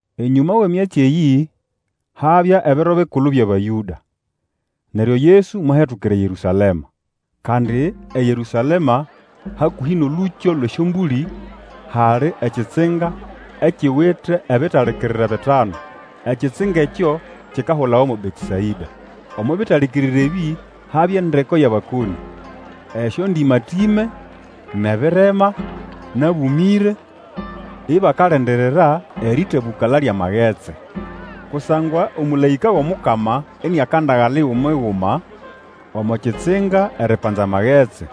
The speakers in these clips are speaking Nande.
Enyũma wʼemyatsi eyĩ, habya ebiro bikulu byʼAbayũda, neryo Yesu mwahetukira eYerũsalema. Kandi eYerũsalema hakũhĩ nʼolũkyo lwʼEsyombũlĩ, hali ekitsinga ekiwite ebitalikirire bitanu. Ekitsinga ekyo kikahulawa mo Betesaĩda. Omo bitalikirire ebĩ habya endeko yʼabakonĩ, esyondĩmatĩme, nʼebirema, nʼabũmĩre, [ibakalindirira erĩtabũkala lyʼamagetsi. Kusangwa omũlaĩka wʼomukama iniakandagala igumi-guma omo kitsinga eripanza amagetsi.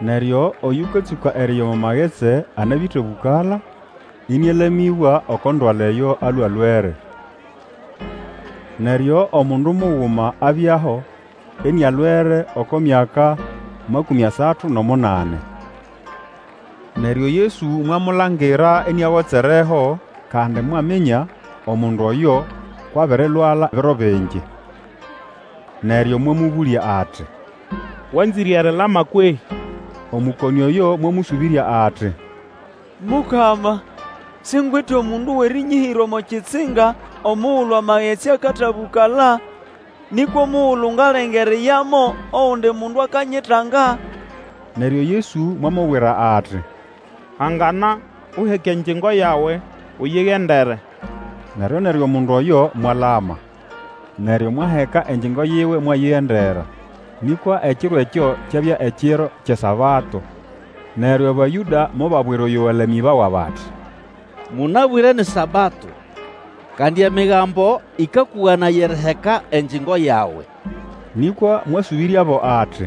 Neryo Oyũkatsũka eriya omo magetsi amabĩtabũkala, inialamĩbwa oko ndwala eyo alwe akwĩre.] Neryo omundu muguma abyaho, inialwere oko myaka makũmĩ asatu nʼomunani. Neryo Yesu mwamulangira iniagotsereho, kandi mwaminya omundu oyo kwʼabirilwala biro bingi. Neryo mwamũbũlya ati, Wanzĩre erilama kwehĩ? Omũkonĩ oyo mwamũsũbĩrya ati, Mukama, singwite omundu wʼerĩnyĩhĩra omo kitsinga omugulu amagetsi akatabũkala; nĩkwa omugulu ngalenga eriyamo, ogundi mundu akanyitanga. Neryo Yesu mwamubwira ati, Hangana, uheke engyingo yawe, uyigendere. Neryo-neryo omundu oyo mwalama. Neryo mwaheka engyingo yiwe, mwayigendera. Nĩkwa ekiro ekyo kyabya ekiro kyʼeSabato. Neryo Abayũda mobabwira oyo walamĩbawa bati, Mũnabwĩre ni Sabato, kandi Emigambo ĩkakũganaya eriheka engyingo yawe. Nĩkwa mwasũbĩryabo ati,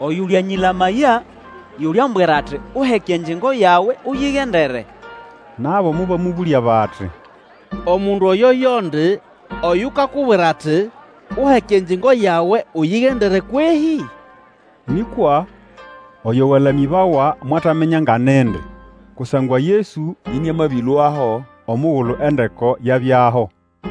Oyũlyanyĩlamaya yuliambwira ati, Uheke engyingo yawe, uyigendere. Nabo mobamũbũlya bati, Omundu oyo yondi oyukakubwira ati, Uheke engyingo yawe uyigendere kwehĩ? Nĩkwa oyo walamĩbawa mwataminya nga nindi, kusangwa Yesu iniamabĩlũaho omugulu endeko yabyaho.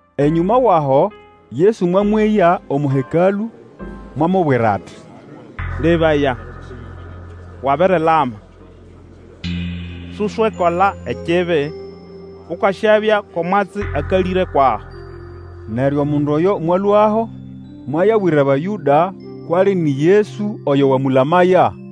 Enyũma wʼaho, Yesu mwamweya omo Hekalũ, mwamubwira ati, Lebaya, wabirilama. Suswekola ekibi, Ukasyabya ko mwatsi akalĩre kwʼaho. Neryo omundu oyo mwalũaho, mwayabwira Abayũda kwʼali ini Yesu oyo wamũlamaya.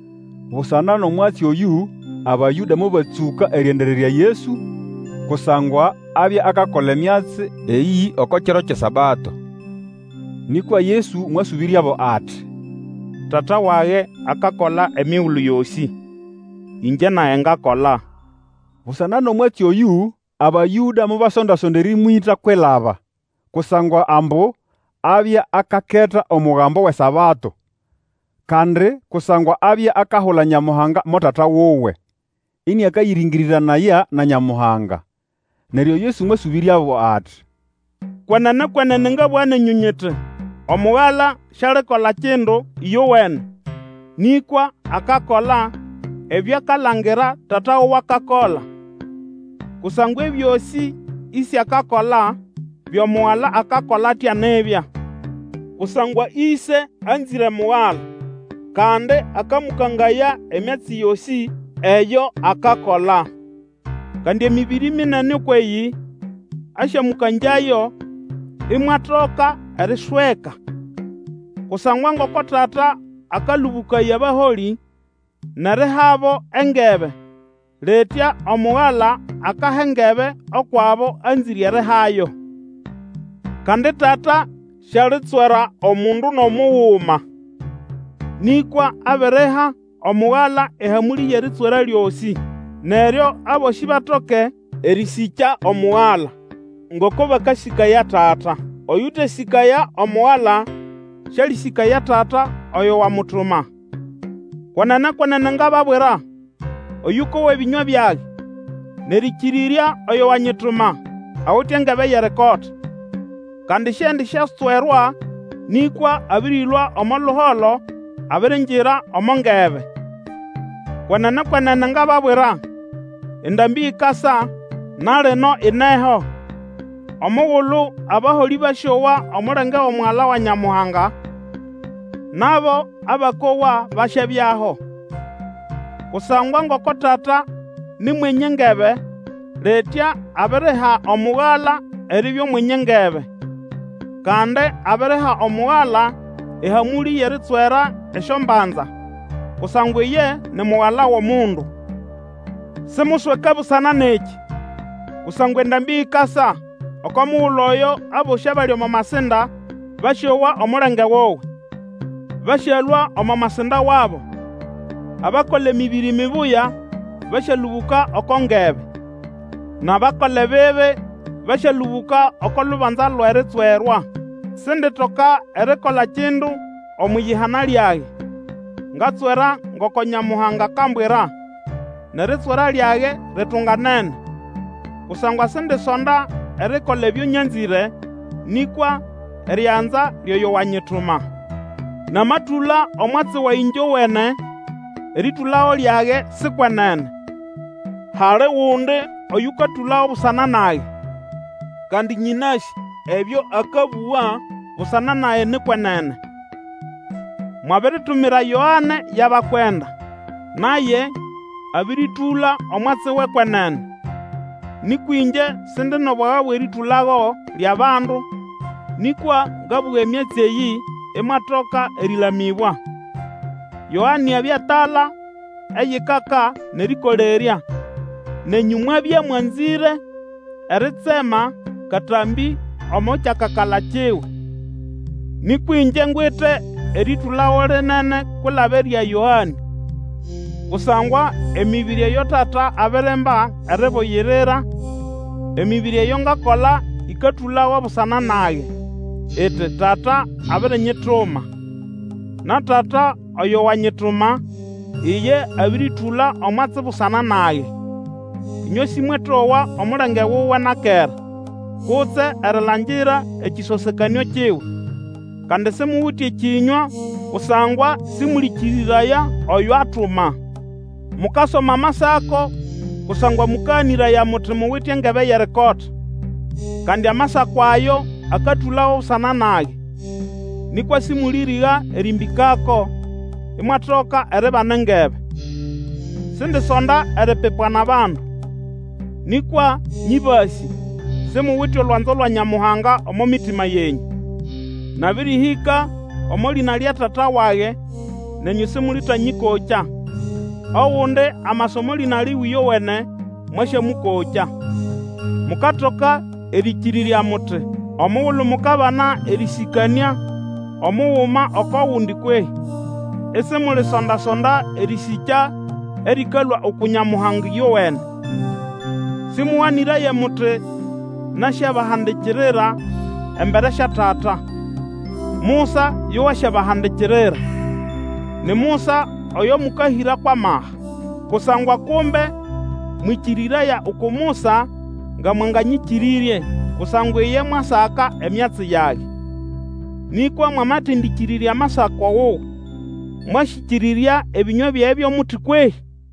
Busana nʼomwatsi oyũ Abayũda mobatsũka erĩendererya Yesu, kusangwa abya akakola emyatsi eyĩ oko kiro kyʼeSabato. Nĩkwa Yesu mwasũbĩryabo ati, Tata wage akakola emigulu yosĩ, ĩngye nage ngakola. Busana nʼomwatsi oyũ Abayũda mobasonda-sonda erĩmwĩta kwilaba; kusangwa ambu abya akaketa omugambo wʼeSabato, kandi kusangwa abya akahula Nyamuhanga mo Tata wuwe, ĩnĩakayĩrĩngĩrĩranaya na Nyamuhanga. Neryo Yesu mwasũbĩryabo ati, Kwenene, kwenene ngabũga nenyũ nyiti, Omugala sialikola kindu ĩyowene, nĩkwa akakola ebyo akalangira Tata wuwe akakola; kusangwa ebyosĩ Ĩse akakola, byo Mugala akakola atya nibya. Kusangwa Ĩse anzĩre Mugala, kandi akamũkangaya emyatsi yosĩ eyo akakola. Kandi emĩbĩrĩ minene ũkwʼeyĩ asyamũkangyayo, imwatoka erisweka. Kusangwa ngoko Tata akalũbũkaya abaholĩ nʼerihabo engebe, litya Omugala akaha engebe ukwʼabo anzĩre erihayo. Kandi Tata sialitswera omundu nʼomuguma. Nĩkwa abiriha Omugala ehamũlĩ yʼeritswera lyosĩ. Neryo abosĩ batoke erĩsĩkya Omugala, ngoko bakasĩkaya Tata. Oyũtesĩkaya Omugala, sĩalĩsĩkaya Tata oyo wamutuma. Kwenene, kwenene ngababwira, oyũkowa ebĩnywa byage, nʼerĩkĩrĩrya oyo wanyituma, awite engebe yʼerikota. Kandi siendisyatswerwa, nĩkwa abĩrĩlũa omo luholo, abiringira omo ngebe. Kwenene, kwenene, ngababwira, endambĩ ikasa, na lino ineho, omugulu abaholĩ basyowa omulenge wʼomugala wa Nyamuhanga, nʼabo abakowa basyabyaho. Kusangwa ngoko Tata ni mwenye engebe, litya abiriha Omugala eribya Omwenye engebe. Kandi abiriha Omugala ehamũlĩ yʼeritswera esyombanza, kusangwa iye ni Mugala wʼOmundu. Simusweke busana nʼekĩ; kusangwa endambĩ ikasa, oko mugulu oyo, abosĩ abali omo masinda basyowa omulenge wuwe. Basyalũa omo masinda wabo; abakola emĩbĩrĩ mibuya basyalũbũka oko ngebe, nʼabakola ebibi basyalũbũka oko lubanza lwʼeritswerwa. Sinditoka erikola kindu omwʼiyihana lyage; ngatswera ngoko Nyamuhanga akambwira, nʼeritswera lyage ritunganene; kusangwa sindisonda erikola ebyo nyanzĩre, nĩkwa erianza lyʼoyo wanyituma. Namatũla omwatsi wage ĩngyowene, erĩtũlago lyage si kwenene. Hali gundi oyũkatũlago busana nage; kandi nyĩnasĩ ebyo akabũga busana nage ni kwenene. Mwabiritumira Yoane yʼabakwenda, naye abĩrĩtũla omwatsi wʼekwenene. Nĩkwa ĩngye Sindi nʼobwaga bwʼerĩtũlago lyʼabandu; nĩkwa ngabũga emyatsi eyĩ, imwatoka erĩlamĩbwa. Yoane abya tala eyikaka nʼerĩkolerya, nenyũ mwabya mwanzĩre eritsema katambĩ omo kyakakala kiwe. Nĩkwa ĩngye ngwite erĩtũlago lĩnene-kwilaba erya Yoane; kusangwa emĩbĩrĩ eyo Tata abirimba eribugirira, emĩbĩrĩ eyo ngakola ĩkatũlago busana nage, iti Tata abirinyituma. Na Tata oyo wanyituma, iye abĩrĩtũla omwatsi busana nage. Inywe Sĩmwetowa omulenge wuwe na kera, kutse erilangira ekĩsosekanĩo kiwe. Kandi simuwite ekĩnywa, kusangwa sĩmũlĩkĩrĩraya oyo atuma. Mukasoma Amasako, kusangwa mũkaganĩraya muti muwite engebe yʼerikota. Kandi Amasako ayo akatũlago busana nage! Nĩkwa sĩmũlĩrĩga erĩmbĩkako imwatoka eribana engebe. Sindisonda eripipwa nʼabandu. Nĩkwa nyĩbasĩ; simuwite olwanzo lwa Nyamuhanga omo mitima yenyũ. Nabĩrĩhĩka omo lĩna lya Tata wage, nenyũ sĩmũlĩtanyĩkokya; ogundi amasa omo lĩna liwe ĩyowene, mwasyamũkokya. Mukatoka erĩkĩrĩrya muti, omugulu mukabana erĩsĩkanĩa omuguma oko gundi kwehĩ, isimulisonda-sonda erĩsĩkya erĩkalũa uku Nyamuhanga ĩyowene. Sĩmũganĩraye muti nasyabahandikirira embere sya Tata. Musa yo wasyabahandikirira. Ni Musa oyo mũkahĩra kwʼamaha. Kusangwa kumbe mwĩkĩrĩraya uku Musa, nga mwanganyĩkĩrĩrye; kusangwa iye mwasaka emyatsi yage. Nĩkwa mwamatendĩkĩrĩrya Amasako wuwe, mwasyĩkĩrĩrya ebĩnywa byage byo muti kwehĩ?